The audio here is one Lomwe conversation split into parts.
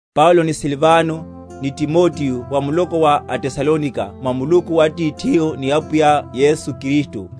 Paulo, ni Silvano, ni Timoteo wa muloko wa aTesalonika mwa Muluku Atithihu ni Apwiya Yesu Kristu: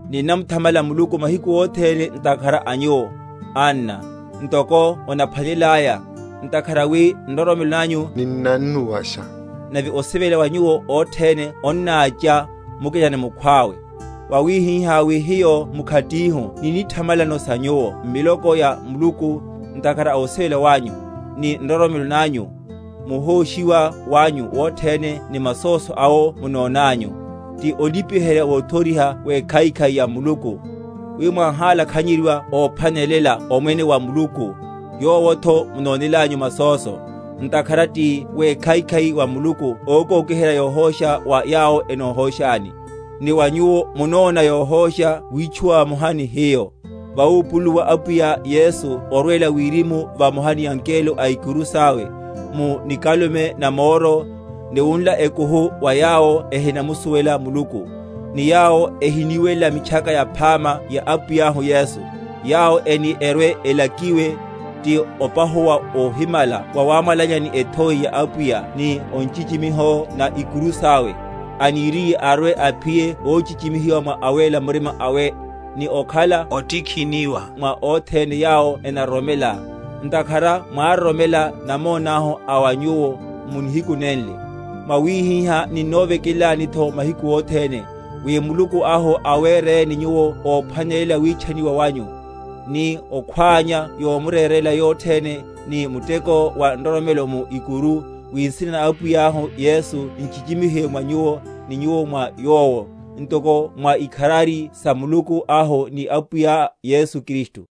Ninnamuthamala Muluku mahiku othene ntakhara a nyuwo, anna, ntoko onaphwanelelaya; ntakhara wi nroromelo nanyu ninnannuwasha, nave osivela wa nyuwo othene onnácha, mukina ni mukhwawe; wawihihá wi hiyo mkhatihu ninnithamalano sa nyuwo m’miloko ya Muluku, ntakhara a ovilela wanyu, ni nroromelo nanyu, muhóshiwa wanyu wothene ni masóso awo munonanyu; ti olipiherya wothoriha wekhaikhai ya Muluku; wi mwáhalakhanyeryiwa óphwanelela omwene wa Muluku, yowotho munonelanyu masóso; ntakhara ti wekhaikhai wa Muluku ókokiherya yohósha wa yawo enohóshani, ni wa nyuwo munona yohósha witchúwa vamoha ni hiyo, vawupululuwa Apwiya Yesu orwela wirimu vamoha ni angelo a ikuru sawe, mu nikalume na moro, ni wunla ekuhu wa yawo ehinamusuwela Muluku, ni yawo ehiniwelela Mitchaka Yaphama ya Apwiyahu Yesu; yawo eni‐erwe‐elakiwe, ti opahuwa wohimala wawámwalanya ni ethoi ya Apwiya, ni o nchichimiho na ikuru sawe, aniriye arwe‐aphiye ochichimihiwa mwa awéla murima awe, ni okhala ótikhiniwa mwa othene yawo enaroromela (ntakhara mwároromela namonáhu a wa nyuwo) mu nihiku nenle. Mwawihihá ninnovekelelanitho mahiku othene, wi Muluku ahu awereni nyuwo óphwanelela witchaniwa wanyu, ni okhwánya yomurerela yothene, ni muteko wa nroromelo mu ikuru; wi nsina na Apwiyahu Yesu nchichimihiwe mwa nyuwo, ni nyuwo mwa Yowo, ntoko mwa ikharari sa Muluku ahu ni Apwiya Yesu Kristu.